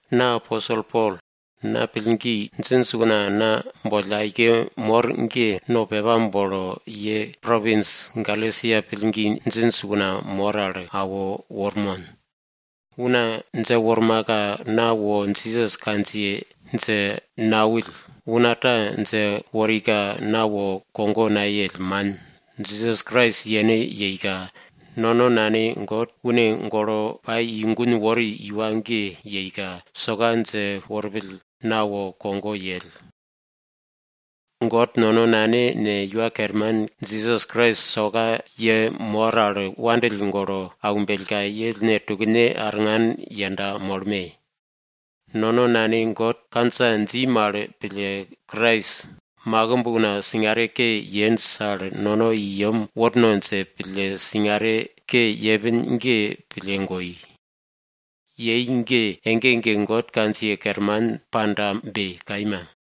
Na aposel Pol. Pillgi djinj una na boll aike mor ge, no pepa bolo ye propins Galesia pillgi djinj una mor al awo wormon. Una dje wormaka na wo Jisas kandjiye dje nawill, una ta dje worika na wo kogo nayell, man. Jisas Krais yene yeika, nono Nane God une golo pai i gun wori iwa ge yeika, soka dje worpill na wo kogo yell. God nono Nane ne, Iwa Kerman Jisas Krais soka ye mor al wopake pille aumbellka, ye ellne tukne arngan yenda moye. Nono Nane God kandja dji mal pille, makimb una singare ke yenj al ge Krais nono i yem worno dje pille singare ke yepin ge pille goi. Yei ge ege ege God kandjiye kerman pandabe! Kaima.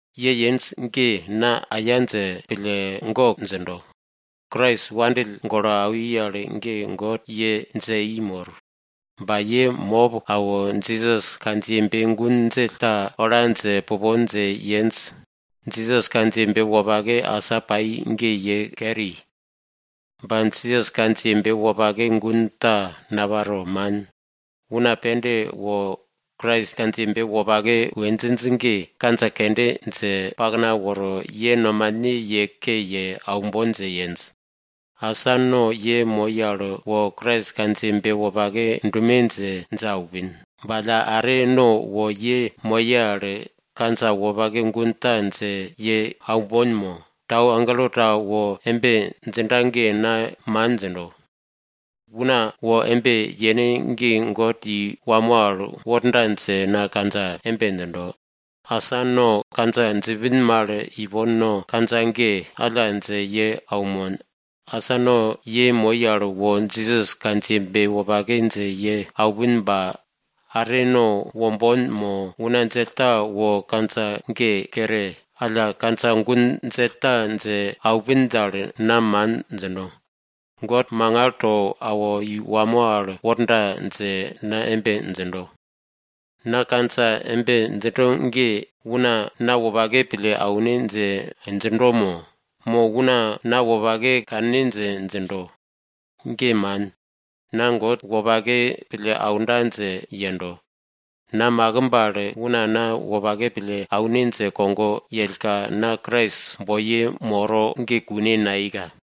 Ye yenj ge na aya dje pille gok djindo. Krais ye wopake pille awi al ge God ye dje i mor. Ba ye mop awo, Jisas kandjiyebe gun djell ta ola dje pupon dje yenj. Jisas kandjiyebe wopake asa pai ge ye keri. Ba Jisas kandjiyebe wopake gun ta naparo, man. Una pende wo Krais kandjiyebe wopake we djinj ge kandja kende dje pakna woro, ye nomane ye ke ye aumbon dje yenj. Asa no ye moi al wo Krais kandjiyebe wopake dume dje, dje aupin. Ba alla are, no wo ye moye al kandja wopake gun ta dje ye aumbon mo, tau agelo ta wo embe djinda ge na man djindo. Una wo embe yene ge God i wamo al worda dje na kandja embe djindo. Asa no kandja djipin mal ipon no kandja ge alla dje ye aunmon. Asa no ye moi al wo Jisas kandjiyebe wopake dje ye aupin ba are una wo kandja ge kere, alla kandja gun djell ta dje awi dal, na man djino. God mangal to awo i wamo al worda dje na embe djindo. Na kandja embe djindo ge una na wopake pille aune dje djindo mo? Mo, una na wopake kanne dje djindo? Ge man. Na God wopake pille aunda dje yendo. Na makimb al una na wopake pille aune dje kogo yellka, na Krais nuye kogoye una moro ge kune nayeika.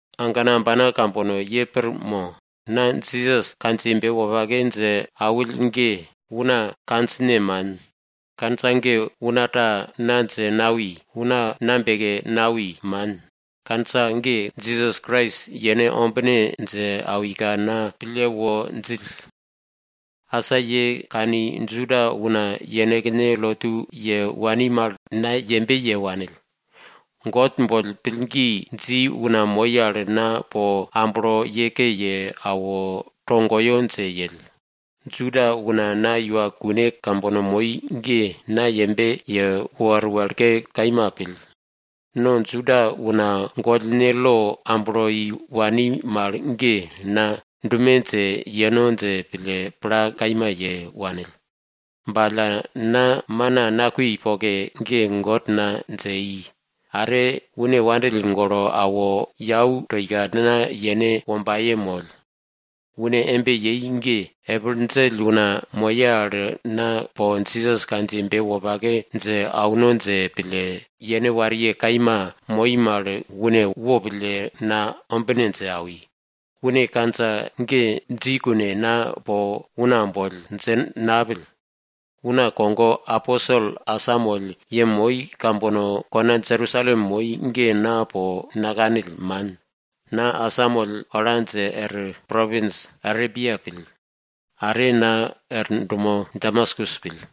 Agana ambana kambono ye pir mo? Na Jisas kandjiyebe wopake dje awill ge, una kandjine man. Kandja ge una ta na dje nawi, una na beke nawi, man. Kandja ge Jisas Krais yene ombine dje awika na pille wo djill. Asa ye kani, Juda una yenekne lotu ye wani mal na embe ye, yembe ye wanill. God boll pillgi dji una moi al na po amblo ye ke ye awo, togoyo dje yell. Juda una na iwa kune kambono moi ge, na yembe ye wor wekle kaima pill. No Juda una gollne lo amblo i wani mal ge, na dume dje yeno dje pille pla kaima ye wanill. Ba alla na mana nakui poke ge, God na dje i, are une na wopake pille awo yau to ika na yene wombaye moll. Une embe yei ge epil djell una moye al na po Jisas kandjiyebe wopake dje auno dje pille, yene wariye kaima moi mal une wopille na ombine dje awi. Une kandja ge dji kune na po una boll dje napill. Una kogo aposel asamoll yemoi kambono kona Jerusalem moi ge na po nakanill, man. Na asamoll ola dje er propins Arebia pill. Are na er dumo Damaskus pill.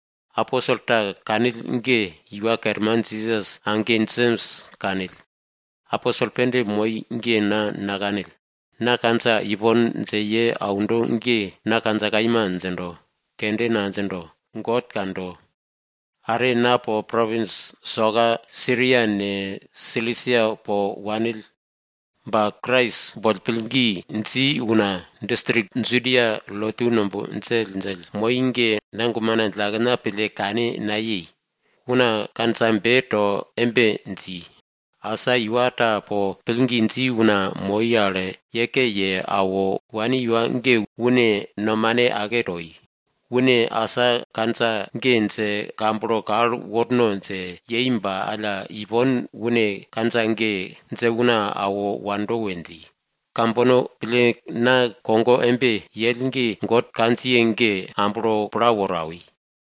Aposel ta kanill ge Iwa Kerman Jisas age Jems kanill, aposel pende moi ge na nakanill. Na kandja ipon dje ye aundo ge, na kandja kaima djindo, kende nadjindo, God kando. Are na po propins soka Siria ne, Silisia po wanill. Ba Krais boll pillgi dji una distrik Judia lotu numb djelldjell moi ge, na gumena djillakena pille kane nayei. Una kandjabe to embe dji, asa iwa ta po pillgi dji una moi al ye ke ye awo wani iwa ge, une nomane ake toi, une asa kandja ge dje kamblo kal worno dje yei ba alla, ipon une kandja ge dje una awo wando we dji. Kambono pille na kogo embe yell ge God kandjiye ge amblo pla woro awi.